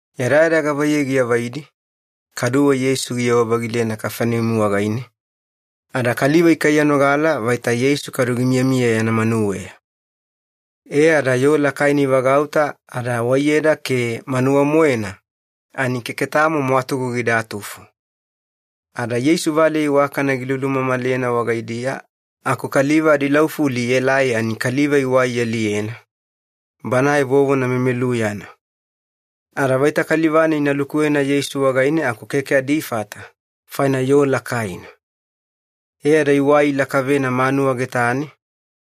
Yadayada gavaiyei giavaidi, kaduwe Yeisu giyewa-vagilena Kafaneumi wagaine, ada kaliva ikaiyanogala vaita Yeisu kadu gimiyamiya yana manuweya. E ada yoo lakaina ivagauta ada waiyeda ke manuwa-moena ani keke tamo mwatugu gidatufo. Ada Yeisu valeya iwakana gilulumamalena wagaidiya aku kaliva adilaufuli ielai ani kaliva iwai ialiyena, banae vovona memeluyana. Ada vaita kaliva-nai ina lukuwena Yeisu wagaine aku keke adifata, faina yoo lakaina. E ada iwai ilakavena manuwa getane,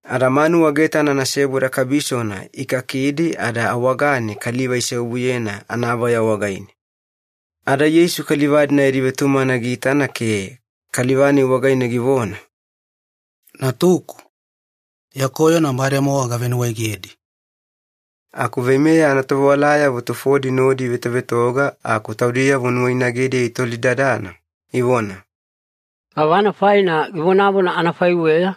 ada manuwa getana anaseboda kabisona ikakidi ada awagane kaliva iseobuyena anavaya wagaine. Ada Yeisu kaliva-dina yadi vetumagana giitana ke kaliva-nai wagaine givona, “Natuku, ya koyona bademowa gavenuwaegedi.” Aku veimeya anatovewalayavo tufodi nodi ivetovetoga aku taudiyavo nuwainagediya itolidadana, ivona, “Gavana faina givonavona anafaiweya?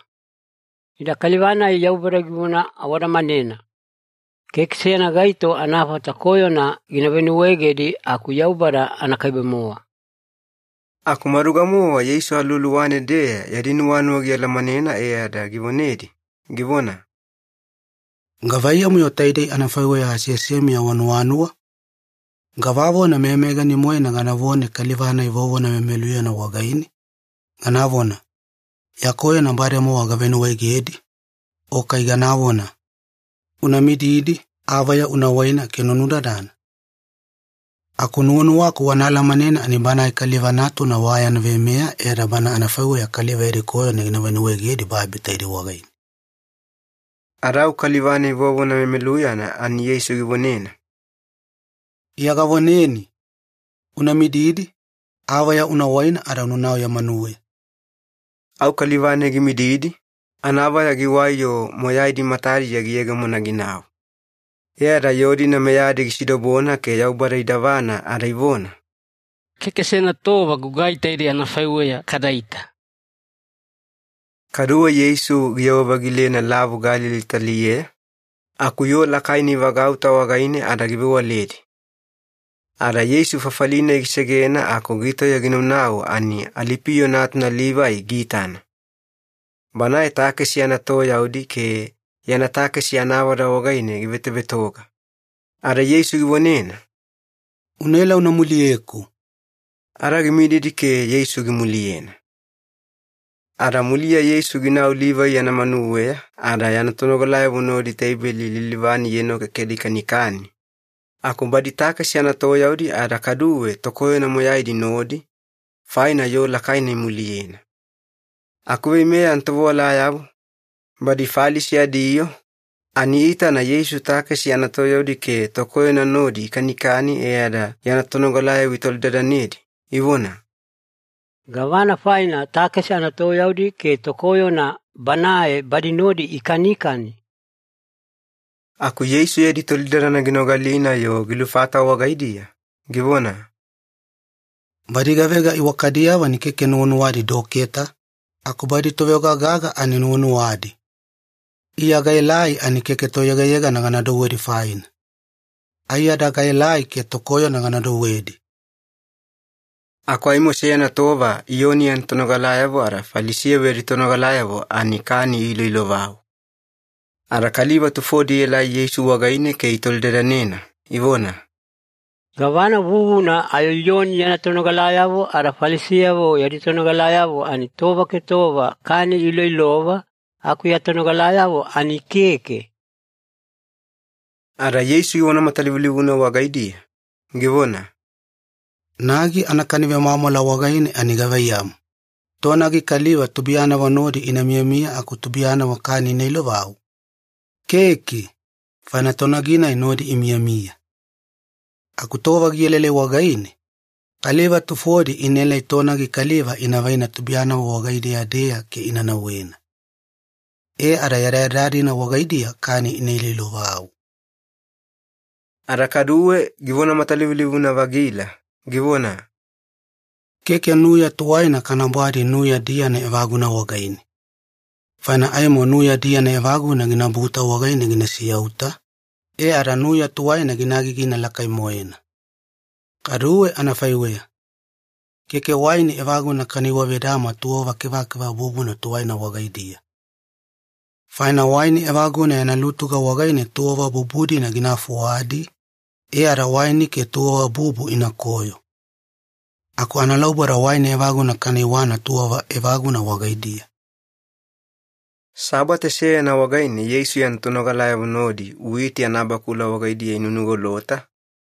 Ida kaliva-nai Yaubada givona awadamanena! Keke seyana gaito anafata koyona gina venuwaegedi aku Yaubada anakaibe-mowa.” Aku maduga-mowa Yeisu aluwaluwane-deya yadi nuwanuwa gialamanena e ada givonedi, givona, “Gavaiyamu-yo taidei anafaiweya aseasemiya wanuwanuwa? Gavavona meyameyagani-moena ganavone kaliva-nai vovona memeluyana wagaine, ganavona, ‘Ya koyona bademowa gavenuwaegedi,’ o kai ganavona, ‘Una mididi, avaya una waina ke una nudadana’? Aku nuwanuwaku wana alamanena ani Banae Kaliva Natuna wa yana veimeya e ada Bana anafaiweya kaliva yadi koyona gina venuwaegedi babi taidei wagaine.” Ada au kaliva-nai vovona memeluyana ani Yeisu givonena, “Iya gavoneni, una mididi, avaya una waina ada unanau ya manuweya.” Au kaliva-nai gimididi, anavaya giwai-yo moyaidi matadiya giyegemona ginau. E ada yoo-dina meyadi gisidobona ke Yaubada idavana ada ivona, “Keke seyana tova gugai taidei anafaiweya kadaita!” Kaduwe Yeisu giyewa-vagilena Lavu Galili taliyeya, aku yoo lakaina ivagauta wagaine ada givewaledi. Ada Yeisu fafali-nai gisegena aku gitauya ginaunau ani Alipiyo natuna Livai giitana. Banae takesi anatoyaudi ke yana takesi anavada wagaine givetovetoga. Ada Yeisu givonena, “Unaela una muliyeku.” Ada gimididi ke Yeisu gimuliyena. Ada muliya Yeisu ginau Livai yana manuweya ada yana tonogalayavo nodi teibeli lilivane ienokekela ikanikani, aku badi takesi anatoyaudi ada kaduwe tokoyona moyaidi nodi, faina yoo lakaina imuliyena. Aku veimeya anatovewalayavo, badi Falisi adiyoo, ani iitana Yeisu takesi anatoyaudi ke tokoyona nodi ikanikani e ada yana tonogalayavo itolidadanedi, ivona, “Gavana faina takesi anatoyaudi ke tokoyona Banae badi nodi ikanikani?” Aku Yeisu yadi tolidadana ginogalina-yo gilufata wagaidiya, givona, “Badi gavega iwakadiyavo ani keke nuwanuwadi doketa, aku badi toveoga gaga ani nuwanuwadi. Iya gaelai ani keke toyegayegana gana douwedi faina. Aiyada gaelai ke tokoyona gana douwedi.” Aku aimo seyana tova Iyoni yana tonogalayavo ada Falisiyavo yadi tonogalayavo ani kani iloilovau. Ada kaliva tufodi ielai Yeisu wagaine ke itolidadanena, ivona, “Gavana vuvuna ayo Iyoni yana tonogalayavo ada Falisiyavo yadi tonogalayavo ani tova ke tova kani iloilova, aku ya tonogalayavo ani keke?” Ada Yeisu givona matalivulivuna wagaidiya, givona, “Nagi anakani vemwamwala wagaine ani gavaiyamu, tonagi kaliva tubuiyanavo nodi ina miyamiya aku tubuiyanavo kani ina ilovau? Keke, faina tonagi-nai nodi imiyamiya. Aku tova gielaelai wagaine, kaliva tufodi inaela tonagi kaliva ina vaina tubuiyanavo wagaidiya-deya ke ina nauwena. E ada yadayada-dina wagaidiya kani ina iloilovau.” Ada kaduwe givona matalivulivuna-vagila, givona, “Keke nuya tuwaina kana bwadi nuya diyana evaguna wagaine. Faina aimo nuya diyana evaguna ginabuta wagaine gina siyauta, e ada nuya tuwaina gina agigina lakai-moena. Kaduwe anafaiweya, keke waini evaguna kana iwavedama tuwava kevakeva bubuna tuwaina wagaidiya. Faina waini evaguna yana lutuga wagaine tuwava bubu-dina gina fuwadi, e ada waini ke tuwava bubu inakoyo. Aku analauboda waini evaguna kana iwana tuwava evaguna wagaidiya.” Sabate seyana wagaine Yeisu yana tonogalayavo nodi witi anabakula wagaidiya inunugolota,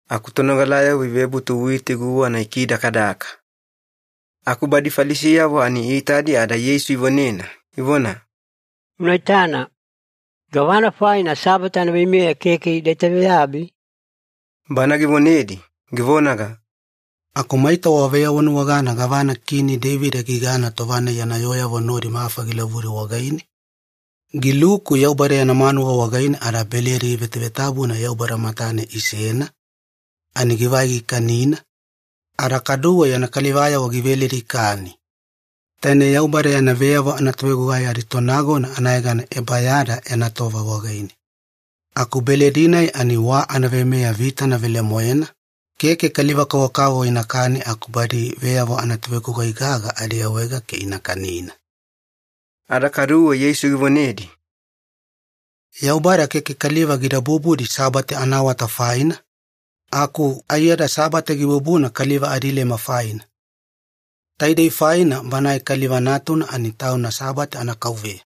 aku tonogalayavo ivebutu witi guwana ikidakadaka. Aku badi Falisiyavo ani iitadi ada Yeisu ivonena, ivona, “Una itana. Gavana faina Sabate anaveimeya keke ida itaveyabi?” Bana givonedi, givonaga, “Aku maita waveyawanuwagana gavana Kini Deivida gigana tova-nai yana yooyavo nodi mafa gilavudi wagaine? Giluku Yaubada yana manuwa wagaine ada beledi vevetabuna Yaubada matane isena, ani givai gikanina, ada kaduwe yana kalivayavo giveledi ikani. Taine Yaubada yana veyavo anatovegugai aditonagona anayegana Ebayada yana tova wagaine. Aku beledi-nai ani wa anaveimeya vitana velemoena, keke kaliva-kavokavovo inakani aku badi veyavo anatovegugai gaga adiawaega ke ina kanina.” Ada kaduwe Yeisu givonedi, “Yaubada keke kaliva gida bubudi Sabate anaawata faina, aku aiyada Sabate gibubuna kaliva adilema faina. Taidei faina Banae Kaliva Natuna ani Tauna Sabate anaKauveya.”